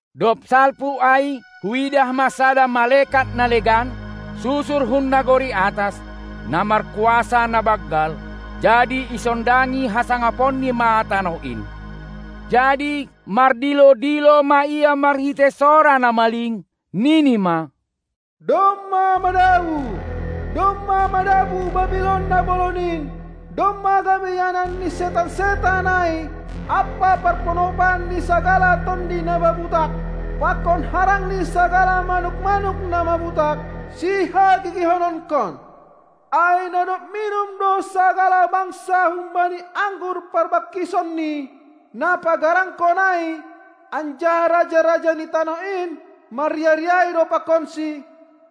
Dob salpu ai huidah ma sada malekat na legan, susur hun nagori atas, na markuasa na banggal, jadi isondangi hasangaponni ma tanoh in. Jadi mardilo-dilo ma ia marhitei sora na maling, nini ma: Domma madabuh, domma madabuh Babilon na bolon in, domma gabe ianan ni setan-setan ai ampa parponopan ni sagala tonduy na mabutak, pakon harang ni sagala manuk-manuk na mabutak, sihagigihononkon. Ai na dob minum do sagala bangsa humbani anggur parbangkisonni, na pagaranghon ai, anjaha raja-raja ni tanoh in marriah-riahi do pakonsi,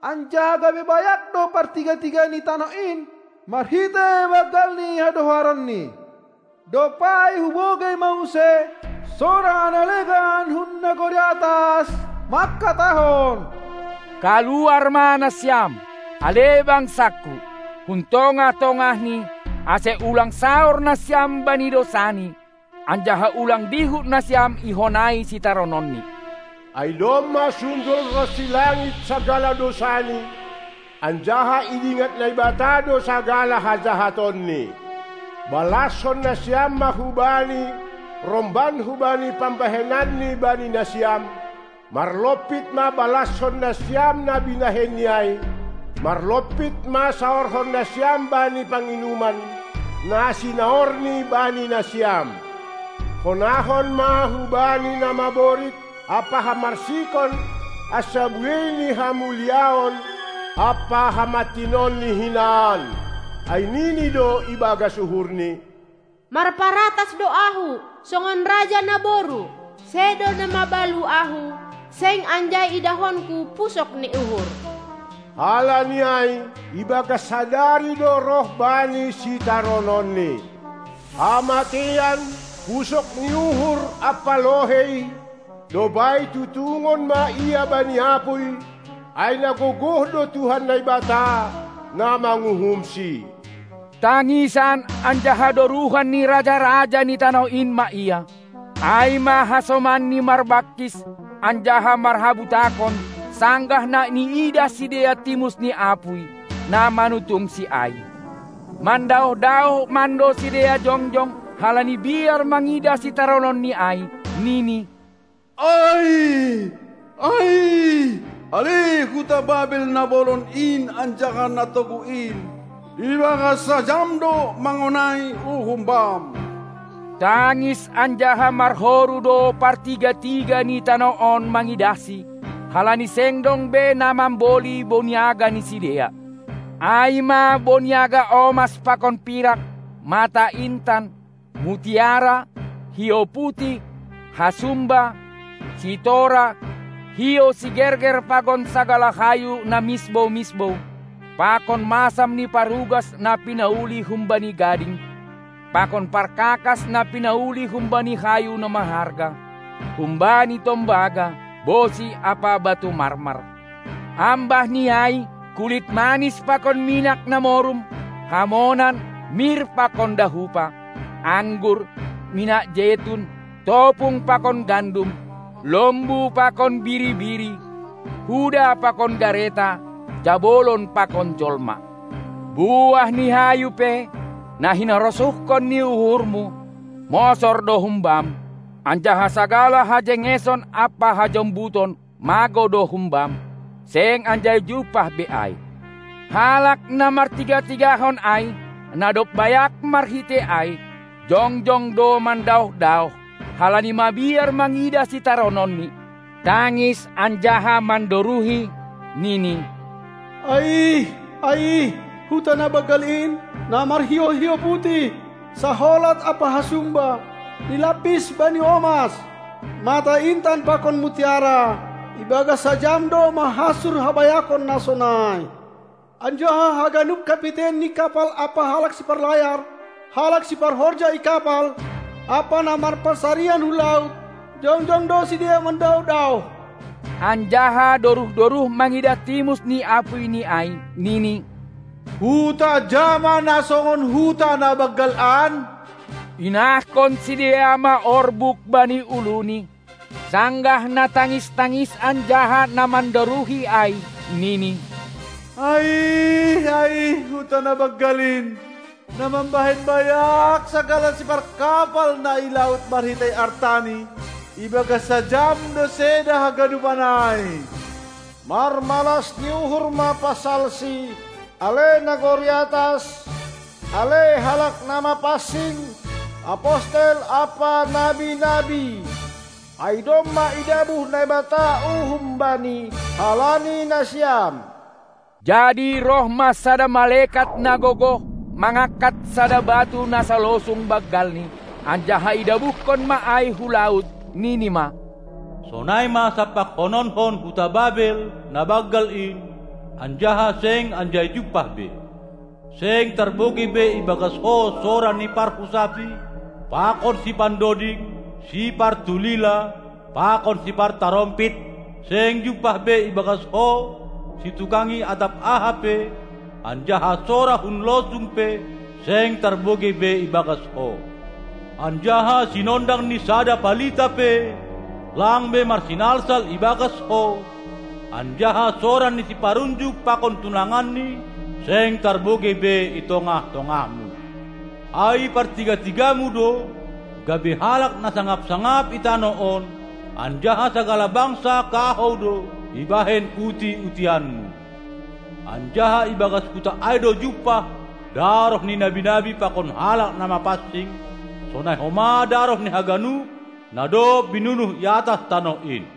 anjaha gabe bayak do partiga-tiga ni tanoh in marhitei banggal ni hadoharonni. Dob ai hubogei ma use sora na legan hun nagori atas manghatahon: Kaluar ma nasiam, ale bangsaKu, hun tongah-tongahni, ase ulang saor nasiam bani dousani, anjaha ulang dihut nasiam ihonai sitarononni. Ai domma sundol ronsi langit sagala dousani, anjaha idingat Naibata do sagala hajahatonni. Balashon nasiam ma hubani romban hubani pambahenanni bani nasiam, marlompit ma balashon nasiam na binahenni ai; marlompit ma saorhon nasiam bani panginuman, na sinaorni bani nasiam. Honahon ma hubani na maborit ampa hamarsikon ansa buei ni hamuliaon ampa hamantinonni hinan. Ai nini do ibagas uhurni: Marparatas do ahu songon raja naboru, sedo na mabalu ahu seng anjai idahonku pusok ni uhur. Halani ai ibagas sadari do roh bani sitarononni: Hamateian, pusok ni uhur ampa lohei, dob ai tutungon ma ia bani apuy, ai na gogoh do Tuhan Naibata, na manguhumsi. Tangisan anjaha doruhan ni raja-raja ni tanoh in ma ia, ai ma hasomanni marbangkis anjaha marhabutakon sanggah na iidah sidea timus ni apuy, na manutungsi ai. Mandaoh-daoh mando sidea jongjong halani biar mangidah sitarononni ai, nini: Aih, aih, ale huta Babel na bolon in anjaha na toguh in! ibagas sajam do mangonai uhum bam. Tangis anjaha marhoru do partiga-tiga ni tanoh on mangidahsi, halani seng dong be na mamboli boniaga ni sidea, ai ma boniaga omas pakon pirak, mata intan, mutiara, hiou putih, hasumba, sitora, hiou sigerger pakon sagala hayu na misbou-misbou, pakon masam ni parugas na pinauli humbani gading, pakon parkakas na pinauli humbani hayu na maharga, humbani tombaga, bosi ampa batu marmar, ambah ni ai kulit manis pakon minak na morum, hamonan, mir pakon dahupa, anggur, minak jetun, topung pakon gandum, lombu pakon biri-biri, huda pakon gareta, jabolon pakon jolma. Buah ni hayu pe, na hinarosuhkon ni uhurmu, mosor do humbam, anjaha sagala hajengeson ampa hajombuton magou do humbam, seng anjai jumpah be ai. Halak na martiga-tigahon ai, na dob bayak marhitei ai. jongjong do mandaoh-daoh, halani mabiar mangidah sitarononni, tangis anjaha mandoruhi, nini: Aih, aih, huta na banggal in, na marhiou hiou putih, saholat ampa hasumba, nilampis bani omas, mata intan pakon mutiara! Ibagas sajam do mahansur habayakon na sonai! Anjaha haganup kapiten ni kapal ampa halak siparlayar, halak siparhorja i kapal ampa na marpansarian hun laut, jongjong do sidea mandaoh-daoh, anjaha doruh-doruh mangidah timus ni apuyni ai, nini: Huta ja ma na songon huta na banggal an? Inahkon sidea ma orbuk bani uluni, sanggah na tangis-tangis anjaha na mandoruhi ai, nini: Aih, aih, huta na banggal in, na mambahen bayak sagala siparkapal na i laut marhitei artani! Ibagas sajam do seda haganupan ai! Marmalas ni uhur ma pasalsi, ale nagori atas, ale halak na mapansing, apostel ampa nabi-nabi! Ai domma idabuh Naibata uhum bani halani nasiam. Jadi roh ma sada malekat na gogoh mangangkat sada batu na salosung banggalni, anjaha idabuhkon ma ai hu laut, nini ma: Sonai ma sampakhononhon huta Babel na banggal in, anjaha seng anjai jumpah be. Seng tarbogei be ibagas ho sora ni parhusapi pakon sipandoding, sipartulila, pakon sipartarompit; seng jumpah be ibagas ho situkangi atap aha pe, anjaha sora hun losung pe seng tarbogei be ibagas ho; anjaha sinondang ni sada palita pe lang be marsinalsal ibagas ho, anjaha sora ni siparunjuk pakon tunanganni seng tarbogei be i tongah-tongahmu. Ai partiga-tigamu do gabe halak na sangap-sangap i tanoh on, anjaha sagala bangsa kahou do ibahen uti-utianmu; anjaha ibagas huta ai do jumpah daroh ni nabi-nabi pakon halak na mapansing, sonai homa daroh ni haganup na dob binunuh i atas tanoh in.